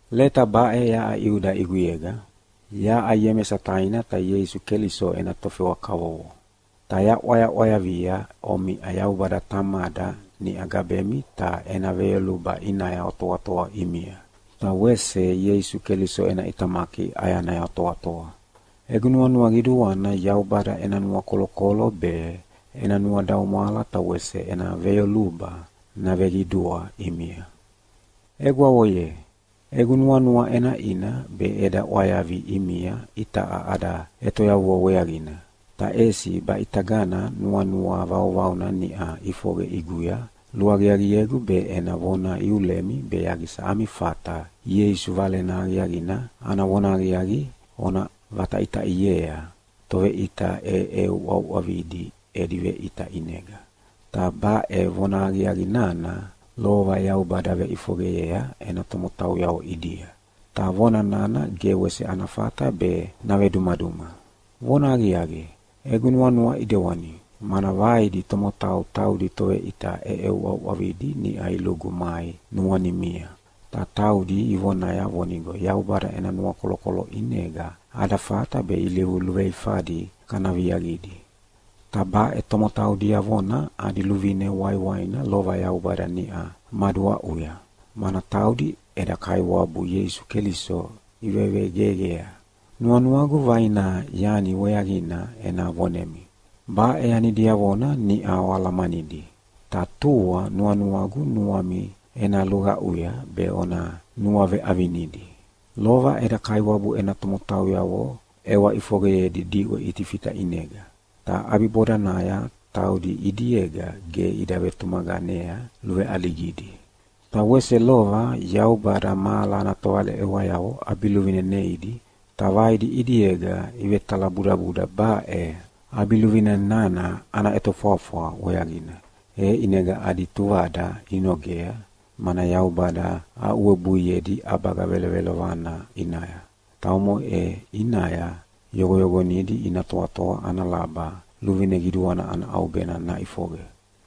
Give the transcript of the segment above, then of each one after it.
Leta baʼe yaʼa Iuda ʼiguyega. Yaʼa Iemesa taina ta Ieisu Keliso ena tofewa kavovo. Ta yaʼwayaʼwayavia omiʼa Yaubada Tamada niʼa gabemi ta ena veyoluba ʼinaya otoatoa ʼimia, ta wese Ieisu Keliso ena ʼitamaki ʼayanaya otoatoa. Egu nuanua qiduana Yaubada ena nuakolokolo be, ena nuadaumwala ta wese ena veyoluba naveqidua ʼimia. Egwavo ye, egu nuanua ʼenaʼina be eda ʼwayavi ʼimia itaʼa ada ʼetoyavua weaqina. Ta ʼesi baʼitagana nuanua vauvauna niʼa ʼifoqe ʼiguya luaqiaqiegu be ena vona iulemi be yaqisa ami fata Ieisu Valena Aqiaqina ana vonahaqiaqi ona vataʼitaʼiea toveʼita ʼeʼeuʼauʼavidi edi veʼita ʼinega. Ta baʼe vonahaqiaqi nana lova Yaubada veʼifoqeyea ena tomotauyavo ʼidia, ta vona nana ge wese ana fata be navedumaduma. Vonahaqiaqi, egu nuanua ʼidewani, mana vaidi tomotau taudi toveʼita ʼeʼeuʼauʼavidi niʼa ilugu mai nuanimia, ta taudi ivonaya vonigo Yaubada ena nuakolokolo ʼinega ada fata be ilivu luveifadi kana viaqidi. Ta baʼe tomotau diavona adi luvine waiwaina lova Yaubada niʼa maduaʼuya, mana taudi eda Kaiwabu Ieisu Keliso ivevegeqea. Nuanuagu vaina yani weaqina ena vonemi. Baʼe yani diavona niʼa oalamanidi, ta tua nuanuagu nuami ena luqaʼuya be ona nuaveʼavinidi. Lova eda Kaiwabu ena tomotauyavo ʼewa ʼifoqeyedi diʼwe Itifita ʼinega. Ta ʼabibodanaya taudi ʼidiega ge ida vetumaqanea luveʼaligidi. Ta wese lova Yaubada mahala ana tovaleʼewayavo ʼabiluvine neidi, ta vaidi ʼidiega ivetalabudabuda baʼe ʼabiluvine nana ana ʼetofwafwa weaqina. E ʼinega adi tuvada inogea, mana Yaubada aʼuwebuiedi ʼabaga velovelovana ʼinaya, ta omoʼe ʼinaya yoqoyoqonidi ina toatoa ana laba luvine qiduana ana ʼaubena naʼifoqe.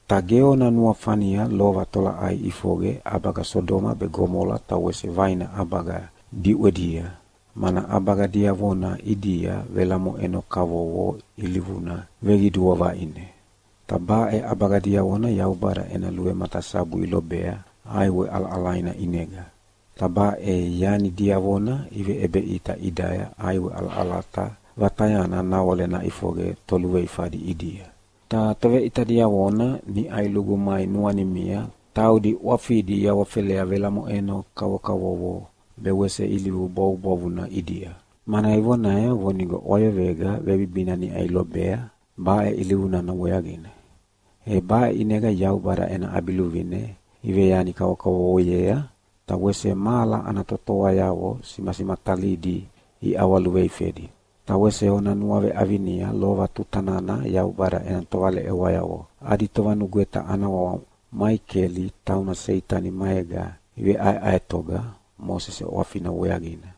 Ta ge ona nuafania lova tolaʼai ʼifoqe ʼabaga Sodoma be Gomola ta wese vaina ʼabaga diʼwedia, mana ʼabaga diavona ʼidia velamoʼeno kavokavovo ilivuna veqidua vaʼine. Ta baʼe ʼabaga diavona Yaubada ena luvematasabu ilobea ʼaiwe ʼalaʼalaina ʼinega. Ta baʼe yani diavona iveʼebeʼita ʼidaya ʼaiwe ʼalaʼalata vatayana nawale naʼifoqe toluveifadi ʼidia. Ta toveʼita diavona niʼa ilugu mai nuanimia taudi ʼwafidi iawafelea velamoʼeno kavokavovo be wese ilivu bwavubwavuna ʼidia, mana ivonaya vonigo ʼwayoqega vebibina niʼa ilobea baʼe ilivu nana weaqina. E baʼe ʼinega Yaubada ena ʼabiluvine iveyani kavokavovoyea, ta wese mahala ana totoayavo simasimatalidi iʼawaluveifedi. Ta wese ona nuaveʼavinia lova tuta nana Yaubada ena tovaleʼewayavo adi tovanugweta ana wawa Maikeli tauna Seitani maega iveʼaeʼaetoga Mosese ʼwafina weaqina,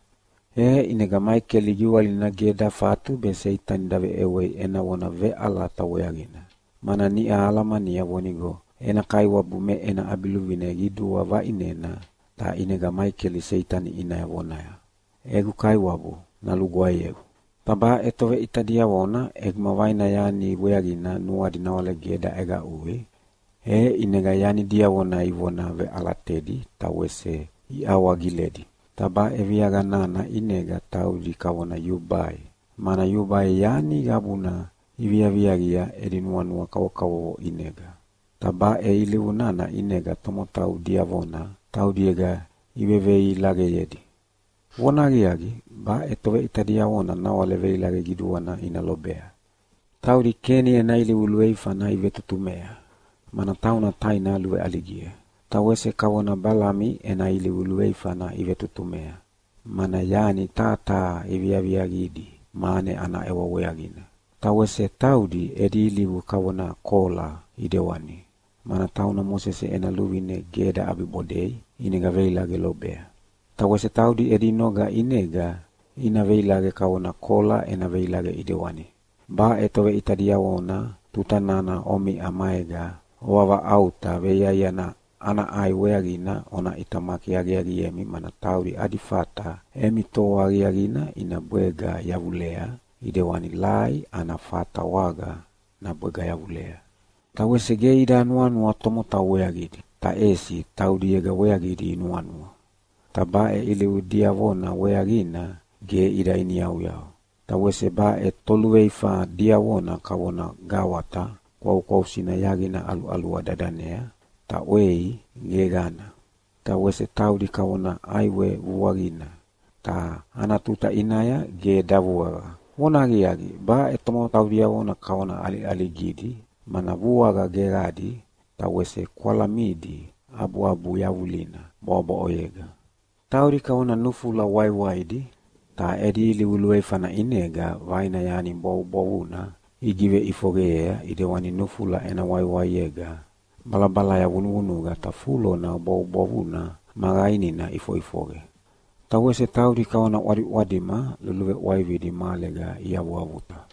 e ʼinega Maikeli giwalina ge dafatu be Seitani daveʼewei ena vona veʼalata weaqina, mana niʼa alamania vonigo ena Kaiwabu me ena ʼabiluvine qidua vaʼinena, ta ʼinega Maikeli Seitani ʼinaya vonaya, “Egu Kaiwabu nalugwaeyeu!” Ta baʼe toveʼita diavona ʼeguma vaina yani weaqina nuadi nawale ge daʼeqaʼui, e ʼinega yani diavona ivona veʼalatedi ta wese iawagiledi. Ta baʼe viaqa nana ʼinega taudi kavona yubai, mana yubai yani qabuna iviaviaqia edi nuanua kavokavovo ʼinega. Ta baʼe ilivu nana ʼinega tomotau diavona taudiega iveveilaqeyedi. Vonahaqiaqi, baʼe toveʼita diavona nawale veilaqe qiduana ina lobea! Taudi Keni ena ilivu luveifana ivetutumea, mana tauna taina luveʼaligia. Ta wese kavona Balami ena ilivu luveifana ivetutumea, mana yani taha taha iviaviaqidi mane ana ʼewa weaqina. Ta wese taudi edi ilivu kavona Kola ʼidewani, mana tauna Mosese ena luvine ge daʼabibodei ʼinega veilaqe lobea. Ta wese taudi edi noga ʼinega ina veilaqe kavona Kola ena veilaqe ʼidewani. Baʼe toveʼita diavona tuta nana omiʼa maega ovavaʼauta veiaiana ana ʼai weaqina ona ʼitamaki aqiaqiemi mana taudi adi fata emi toa aqiaqina ina bwega yavulea ʼidewani lai ana fata waga nabwega yavulea. Ta wese ge ida nuanua tomotau weaqidi, ta ʼesi taudiega weaqidi inuanua. Ta baʼe ilivu diavona weaqina ge ida iniyauyau. Ta wese baʼe toluveifa diavona kavona gawata kwaukwausina yaqina ʼaluʼalua dadanea, ta ʼwei geqana. Ta wese taudi kavona ʼaiwe vuavuaqina, ta ana tuta ʼinaya ge davuaqa. Vonahaqiaqi, baʼe tomotau diavona kavona ʼaliʼaligidi, mana vuaqa geqadi ta wese kwalamidi abuabu yavulina bwaʼobwaʼoyega. Taudi kavona nufula waiwaidi, ta edi ilivu luveifana ʼinega vaina yani bwavubwavuna igiveʼifoqeyea ʼidewani nufula ena waiwaiega balabalaya vunuvunuqa ta fulona bwavubwavuna ma qainina ʼifoʼifoqe. Ta wese taudi kavona ʼwadiʼwadima luluveʼwaividi mahalega iavuavuta.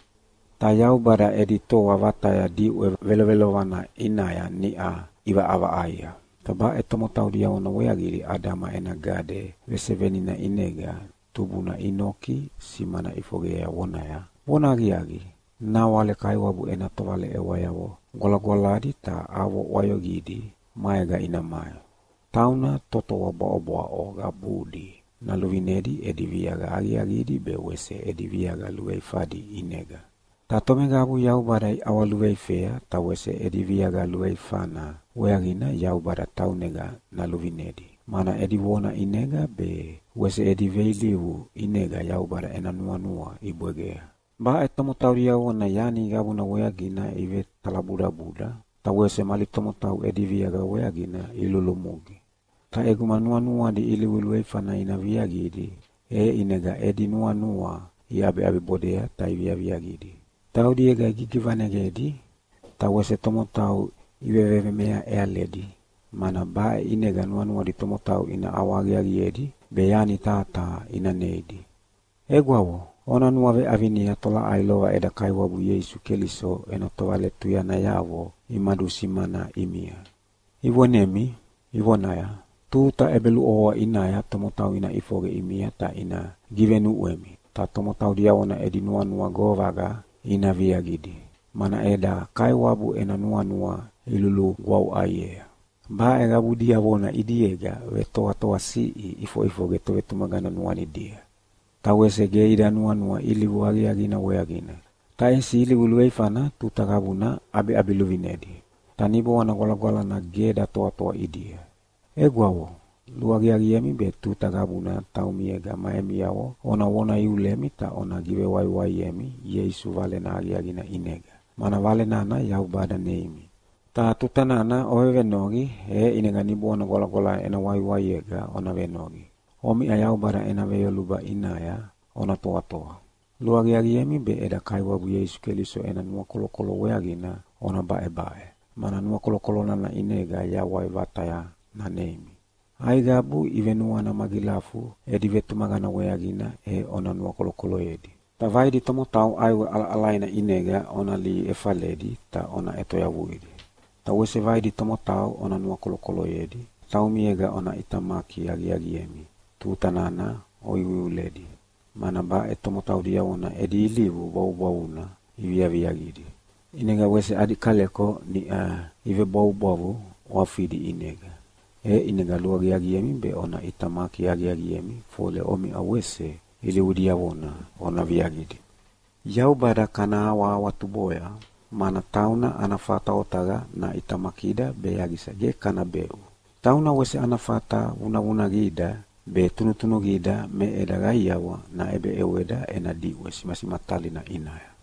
Ta Yaubada edi toa vataya diʼwe velovelovana ʼinaya niʼa ʼivaʼavaʼaia. Ta baʼe tomotau diavona weaqidi Adama ena gade vesevenina ʼinega tubuna Inoki simana ʼifoqeyea vonaya, “Vonahaqiaqi, nawale Kaiwabu ena tovaleʼewayavo gwalagwaladi ta avo ʼwayoqidi maega ina mai. “Tauna totoa bwaʼobwaʼo qabudi naluvinedi edi viaqa aqiaqidi be wese edi viaqa luveifadi ʼinega. Ta tomeqabu Yaubada iʼawaluveifea ta wese edi viaqa luveifana weaqina Yaubada taunega naluvinedi, mana edi vona ʼinega be wese edi veilivu ʼinega Yaubada ena nuanua ibwegea.” Baʼe tomotau diavona yani qabuna weaqina ivetalabudabuda ta wese mali tomotau edi viaqa weaqina ilulumugi. Ta ʼeguma nuanuadi ilivu luveifana ina viaqidi, e ʼinega edi nuanua iʼabiʼabibodea ta iviaviaqidi. Taudiega igigivaneqedi, ta wese tomotau ivevemea ʼealedi, mana baʼe ʼinega nuanuadi tomotau ina ʼawahaqiaqiedi be yani taha taha ina neidi. Egwavo, ona nuaveʼavinia tolaʼai lova eda Kaiwabu Ieisu Keliso ena tovaletuyanayavo imadusimana ʼimia, ivonemi ivonaya, “Tuta ʼebeluʼovoa ʼinaya tomotau ina ʼifoqe ʼimia ta ina givenuʼwemi, ta tomotau diavona edi nuanua govaqa ina viaqidi, mana eda Kaiwabu ena nuanua ilulugwavuʼaiea.” Baʼe qabu diavona ʼidiega vetoatoasiʼi ʼifoʼifoqe tovetumaqana nuanidia. Ta wese ge ida nuanua ilivu aqiaqina weaqina, ta ʼesi ilivu luveifana tuta qabuna ʼabiʼabiluvinedi, ta Niboana Gwalagwalana ge datoatoa ʼidia. Egwavo, luaqiaqiemi be tuta qabuna taumiega ma emiavo ona vona iulemi ta ona givewaiwaiemi Ieisu Valena Aqiaqina ʼinega, mana Vale nana Yaubada neimi. Ta tuta nana ovevenoqi, e ʼinega Niboana Gwalagwalana ena waiwaiega ona venoqi. Omiʼa Yaubada ena veyoluba ʼinaya ona toatoa. Luaqiaqiemi be eda Kaiwabu Ieisu Keliso ena nuakolokolo weaqina ona baʼebaʼe, mana nuakolokolo nana ʼinega yawai vataya naneimi. Aiqabu ivenuana magilafu edi vetumaqana weaqina e ona nuakolokoloyedi. Ta vaidi tomotau ʼaiwe ʼalaʼalaina ʼinega ona lihi efaledi ta ona ʼetoyavuidi. Ta wese vaidi tomotau ona nuakolokoloyedi, ta taumiega ona ʼitamaki aqiaqiemi tuta nana oiuiuledi, mana baʼe tomotau diavona edi ilivu bwavubwavuna iviaviaqidi, ʼinega wese adi kaleko niʼa ivebwavubwavu ʼwafidi ʼinega. E ʼinega luaqiaqiemi be ona ʼitamaki aqiaqiemi fole omiʼa wese ilivu diavona ona viaqidi. Yaubada kana awahawatuboya, mana tauna ana fata otaqa naʼitamakida be yaqisa ge kana beʼu. Tauna wese ana fata vunavunaqida be tunutunuqida me eda qaiawa naʼebeʼeweda ena diʼwe simasimatalina ʼinaya.